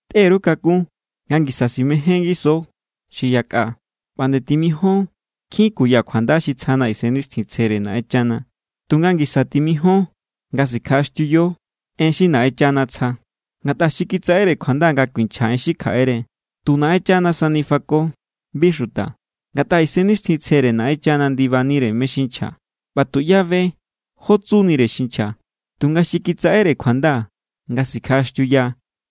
Tꞌe_ru kakun nga ngisa simején ngiso xi yakꞌa ꞌba nde timijon nkjin kuya kjuanda xi tsjana Isennixtjintsjere Naꞌenchana. Tunga ngisa timijon nga sikjaꞌaxtiuyo en xi Naꞌenchana tsja. Ngatꞌa xi kitsaꞌere kjuanda nga kuinchja en xi kjaꞌere, tu Naꞌenchana sani fako, bi xuta. Ngatꞌa Isennixtjintsjere Naꞌenchana ndibanire mé= xi nchja, ꞌba tuꞌyá be jó tsunire xi nchja. Tunga xi kitsaꞌere kjuanda nga tsikjaꞌaxtiuya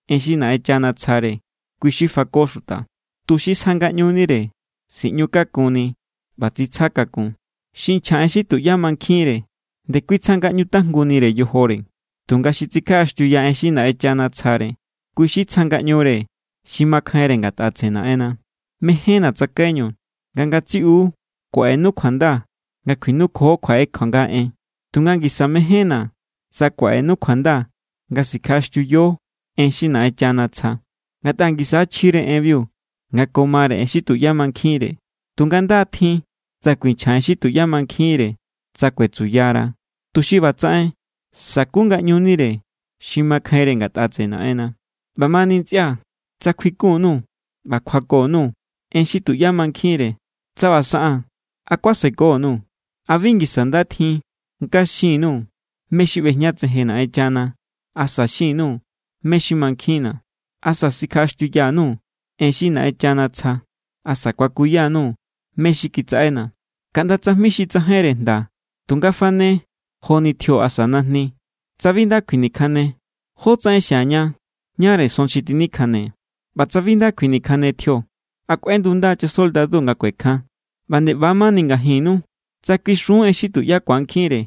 en xi Naꞌenchana tsjare, kui xi fako xuta, tuxi sja ngaꞌñunire, siꞌñu kakunni ꞌba tsitsja kakun. Xi nchja en xi tuꞌyá mankjinre ndekui tsjangaꞌñu tajngunire yojore. Tunga xi tsikjaꞌaxtiuya en xi Naꞌenchana tsjare, kui xi tsja ngaꞌñure xi makjainre ngatꞌa tseꞌe Naꞌenna. Mejénna̱ tsakaiñu nga ngatsiꞌu kuaꞌenu kjuanda nga kjuinukjuo kjaꞌe kjuanga en, tunga ngisa mejénna̱ tsa kuaꞌenu kjuanda nga sikjaꞌaxtiuyo en xi Naꞌenchana tsja. Ngatꞌa ngisa= chjire enbiu nga ko mare en xi tuꞌyá mankjinre. Tunga nda= tjin tsa kuinchja en xi tuꞌyá mankjinre tsa kuetsuyara, tuxi ꞌbatsaꞌen sa̱ku ngaꞌñunire xi makjainre ngatꞌa tseꞌe Naꞌenna. ꞌBamani ntsꞌia̱, tsa kjuikun_nuu̱ ꞌba kjuako_nuu̱ en xi tuꞌyá mankjinre, tsa ꞌba saꞌaa̱n, ¿a kuaseko_nuu̱? ¿A bi ngisa nda tjin nga xin_nuu̱ mé= xi ꞌbejñatsejen Naꞌenchana, asa xin_nuu̱ mé= xi mankjinna̱, asa sikjaꞌaxtiuya_nuu̱ en xi Naꞌenchana tsja, asa kuakuya_nuu̱ mé= xi kitsaꞌena̱? Kaꞌnda tsajmi xi tsajainre jnda tunga fane joni tjio asa najni, tsa bi nda kjuinikjane, ¿jó tsaꞌen xiaña ñáre son xi tjinikjane? ꞌBa tsa bi nda kjuinikjane tjio, ¿a kꞌuendunda= chasoldadu nga kuekjan? ꞌBa nde ꞌba= mani ngajinnu. Tsa kuixun en xi tuꞌyá ku̱ankjinre,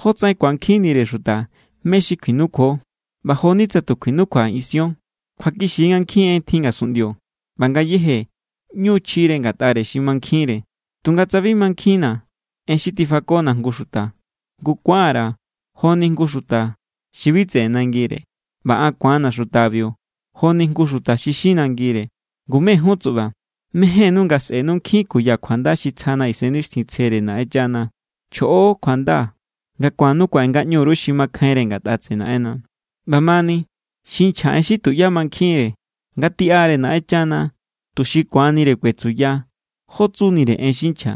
¿jótsaꞌen ku̱ankjinnire xuta mé= xi kjuinukjuo? ꞌBa jo=ni tsa tu kjuinukjuajin ision. Kjuakixi= nga nkjin en tjin ngasunꞌndio ꞌba ngayéje ꞌñu= chjire ngatꞌare xi mankjinre. Tunga tsa bi mankjinna̱ en xi tifakona̱ jngu xuta, ngu ku̱an_ra̱ joni jngu xuta xi bi tseꞌe nangire, ꞌba an ku̱anna̱ xutabiu joni jngu xuta xi xin nangire. Ngu, mé= jun tsuꞌba, mejénnú nga sꞌe̱nu nkjin kuya kjuanda xi tsjana Isennixtjintsjere Naꞌenchana, chjoꞌo kjuanda nga ku̱annu kuaꞌe ngaꞌñu_ru xi makjainre ngatꞌa tseꞌe Naꞌenna. ꞌBamani, xi nchja en xi tuꞌyá mankjinre, ngatiꞌare Naꞌenchana, tuxi ku̱anire kuetsuya jó tsunire en xi nchja.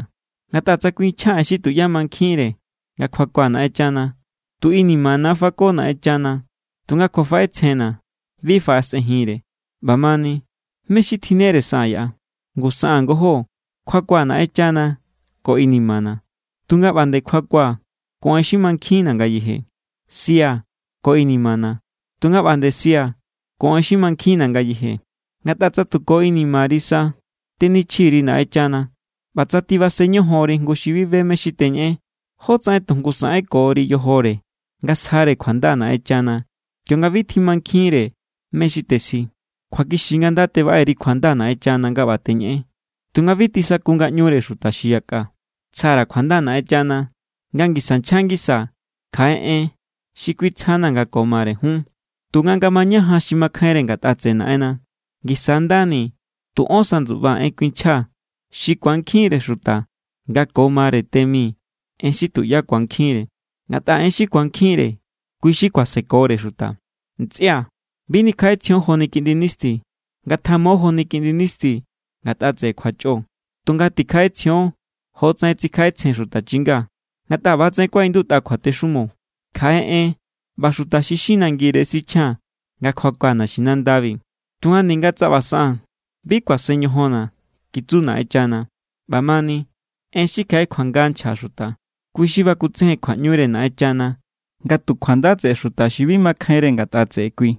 Ngatꞌa tsa kuinchjaa̱ en xi tuꞌyá mankjinre nga kjuakua̱ Naꞌenchana, tu inimana= fako Naꞌenchana tunga kjuafaꞌetsjenna̱ bi faꞌasꞌenjinre. ꞌBamani, ¿mé= xi tjinnere saꞌaa̱n yaꞌa? Ngu saꞌaa̱n ngojó. Kjuakua̱ Naꞌenchana ko inimana̱, tunga ꞌba nde kjuakua̱ ko en xi mankjinna̱ ngayeje. Sia̱ ko inimana̱, tunga ꞌba nde sia̱ ko en xi mankjinna̱ ngayeje. Ngatꞌa tsa tu ko inimari sa tenichji_ri Naꞌenchana, ꞌba tsa tibasen ñojonri jngu xi bi be mé= xi teñeꞌen, ¿jótsaꞌen tu jngu saꞌenkori yojore nga sjare kjuanda Naꞌenchana, kionga bi tjimankjinre mé= xi tesji? Kjuakixi= nga nda tebaꞌe_ri kjuanda Naꞌenchana nga ꞌba teñeꞌen, tunga bi tisaku ngaꞌñure xuta xi yakꞌa. Tsja_ra̱ kjuanda Naꞌenchana nga ngisa nchja ngisaa̱ kjaꞌe en xi Kui tsjana nga ko mare jun. Tunga nga mañajan xi makjainre ngatꞌa tseꞌe Naꞌenna, ngisa= ndani tu ón sa ndsuꞌbaa̱ en kuinchjaa̱ xi ku̱ankjinre xuta nga ko mare te mi en xi tuꞌyá ku̱ankjinre, ngatꞌa en xi ku̱ankjinre, kui= xi kuasekore xuta. Ntsꞌia̱, bi nikjaꞌetsjion joni kiꞌndi nisti. Ngatjamo joni kiꞌndi nisti ngatꞌa tseꞌe kjuachꞌo, tunga tikjaꞌetsjion jotsaꞌen tsikjaꞌetsjen xuta chinga. Ngatꞌa ꞌba=tsaꞌen kuaꞌindutꞌa kjuatexumo: “Kjaꞌe en ꞌba xuta xi xin nangire sichjia̱n nga kjuakua̱ naxinandabi. Tunga ninga tsa ꞌba saꞌaa̱n, bi kuasen ñojonna̱, kitsu Naꞌenchana.” ꞌBamani, en xi kjaꞌe kjuanga nchja xuta, kui xi bakutsejen kjuaꞌñure Naꞌenchana nga tu kjuanda tseꞌe xuta xi bi makjainre ngatꞌa tseꞌe kui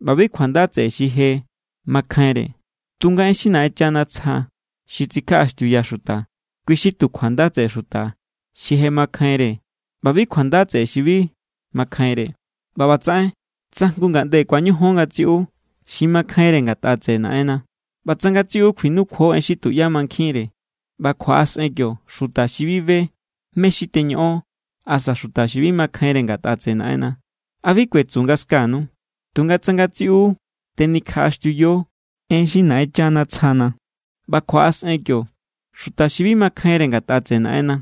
ꞌba bi kjuanda tseꞌe xi je makjainre. Tunga en xi Naꞌenchana tsja xi tsikjaꞌaxtiuya xuta, kui xi tu kjuanda tseꞌe xuta xi je makjainre ꞌba bi kjuanda tseꞌe xi bi makjainre. ꞌBa ꞌbatsaꞌen tsa jngu ngaꞌnde ku̱añojon ngatsiꞌu xi makjainre ngatꞌa tseꞌe Naꞌenna ꞌba tsa ngatsiꞌu kjuinukjuo en xi tuꞌyá mankjinre, ꞌba kjuaꞌasꞌen kio xuta xi bi be mé= xi teñoꞌon asa xuta xi bi makjainre ngatꞌa tseꞌe Naꞌenna, ¿a bi kuetsu nga skanu? Tunga tsa ngatsiꞌu tenikjaꞌaxtiuyo en xi Naꞌenchana tsjana, ꞌba kjuaꞌasꞌen kio xuta xi bi makjainre ngatꞌa tseꞌe Naꞌenna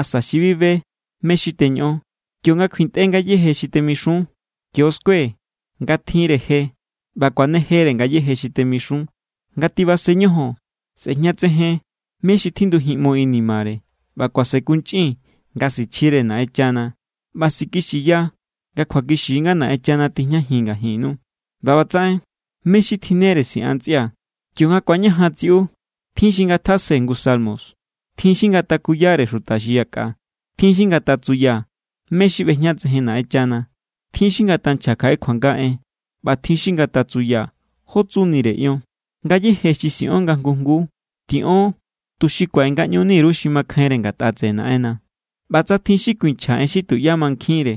asa xi bi be mé= xi teñoꞌon, kionga kjuintꞌe ngayéje xi temixun, kio skue nga tjinre je ꞌba kuanejere ngayéje xi temixun. Nga tibasen ñojon, sꞌe̱jñatsejen mé= xi tjinndujinꞌmo inimare, ꞌba kuasenkunchꞌin nga sichjire Naꞌenchana, ꞌba sikixiya nga kjuakixi nga Naꞌenchana tijñajin ngajinnu. ꞌBa ꞌbatsaꞌen, ¿mé= xi tjinnere siꞌan, ntsꞌia̱? Kionga ku̱añajan tsiꞌu, tjin xi ngatjase jngu salmo, tjin xi ngatakuyare xuta xi yakꞌa, tjin xi ngatatsuya mé= xi ꞌbejñatsejen Naꞌenchana, tjin xi ngatanchja kjaꞌe kjuanga en, ꞌba tjin xi ngatatsuya jó tsunire ion. Ngayéje xi siꞌon nga jngu jnguu, tiꞌon tuxi kuaꞌe ngaꞌñuni_ru xi makjainre ngatꞌa tseꞌe Naꞌenna. ꞌBa tsa tjin xi kuinchja en xi tuꞌyá mankjinre,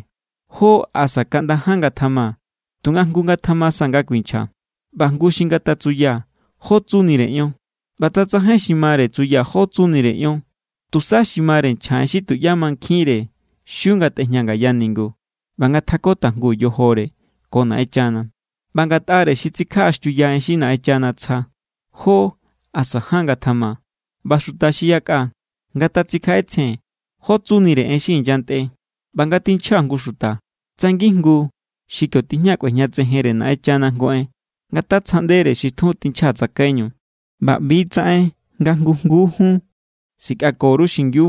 jó asa kaꞌnda ján ngatjama. Tunga jngu ngatjama sa nga kuinchja, ꞌba jngu xi ngatatsuya jó tsunire ion. ꞌBa tsa tsajain xi mare tsuya jó tsunire ion, tusa xi mare nchja en xi tuꞌyá mankjinre xiu ngatꞌejña ngaya ningu ꞌba ngatjako tajngu yojore ko Naꞌenchana. ꞌBa ngatꞌare xi tsikjaꞌaxtiuya en xi Naꞌenchana tsja, jó asa ján ngatjama. ꞌBa xuta xi yakꞌa ngatatsikjaꞌetsjen jó tsunire en xi inyantꞌe. ꞌBa nga tinchja jngu xuta, tsa ngijngu xi kio tijña kꞌuejñatsejenre Naꞌenchana jngu en, ngatatsjaꞌndere xi tjun tinchja tsakaiñu. ꞌBa ꞌbi=tsaꞌen nga jngu jnguu jun sikꞌako_ru xingiu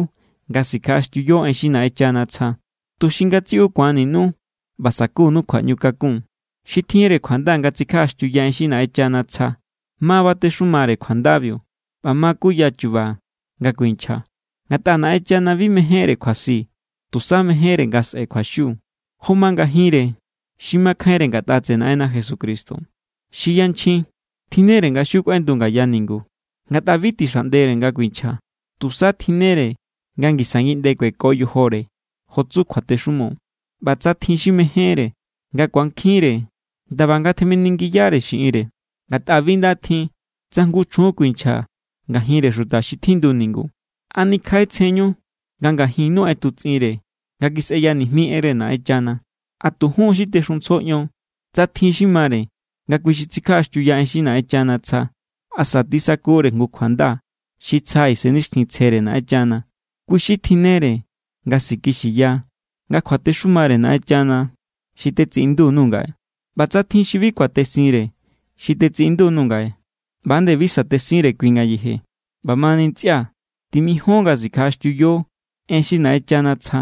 nga sikjaꞌaxtiuyo en xi Naꞌenchana tsja, tuxi ngatsiꞌu ku̱anninu ꞌba sa̱kunu kjuaꞌñukakun. Xi tjinre kjuanda nga tsikjaꞌaxtiuya en xi Naꞌenchana tsja ma batexumare kjuandabiu ꞌba ma kuya chu̱ba̱ nga kuinchja. Ngatꞌa Naꞌenchana bi mejénre kjuasi, tusa mejénre nga sꞌe̱ kjuaxiu. Jo ma ngajinre xi makjainre ngatꞌa tseꞌe Naꞌenna Jesucristo, xi yanchjin tjinnere nga xiu kꞌuendu ngaya ningu. Ngatꞌa bi tixaꞌndere nga kuinchja. Tusa tjinnere nga ngisa ngiꞌnde kueko yojore, jo tsu kjuatexumo. ꞌBa tsa tjin xi mejénre nga ku̱ankjinre, ndaba ngatjaminingiyare xiꞌinre. Ngatꞌa bi nda tjin tsa jngu chjun kuinchja ngajinre xuta xi tjindu ningu. ¿A nikjaꞌetsjenñu nga ngajinnu ꞌetutsꞌinre nga kisꞌeya nijmi enre Naꞌenchana? ¿A tu jun= xi texuntsjo ion? Tsa tjin xi mare nga kui xi tsikjaꞌaxtiuya en xi Naꞌenchana tsja asa tisakure jngu kjuanda xi tsja Isennixtjintsjere Naꞌenchana, kui xi tjinnere nga sikixiya nga kjuatexumare Naꞌenchana xi tetsiꞌindu_nuu̱ ngaꞌe. ꞌBa tsa tjin xi bi kuatesinre xi tetsiꞌindu_nuu̱ ngaꞌe, ꞌba nde bi sa̱tesinre kui ngayeje. ꞌBamani ntsꞌia̱, timijon nga sikjaꞌaxtiuyo en xi Naꞌenchana tsja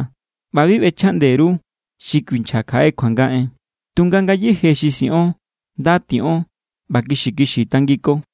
ꞌba bi ꞌbechjaꞌnde_ru xi kuinchja kjaꞌe kjuanga en. Tunga ngayéje xi siꞌon, nda tiꞌon ꞌba kixi kixi tangiko.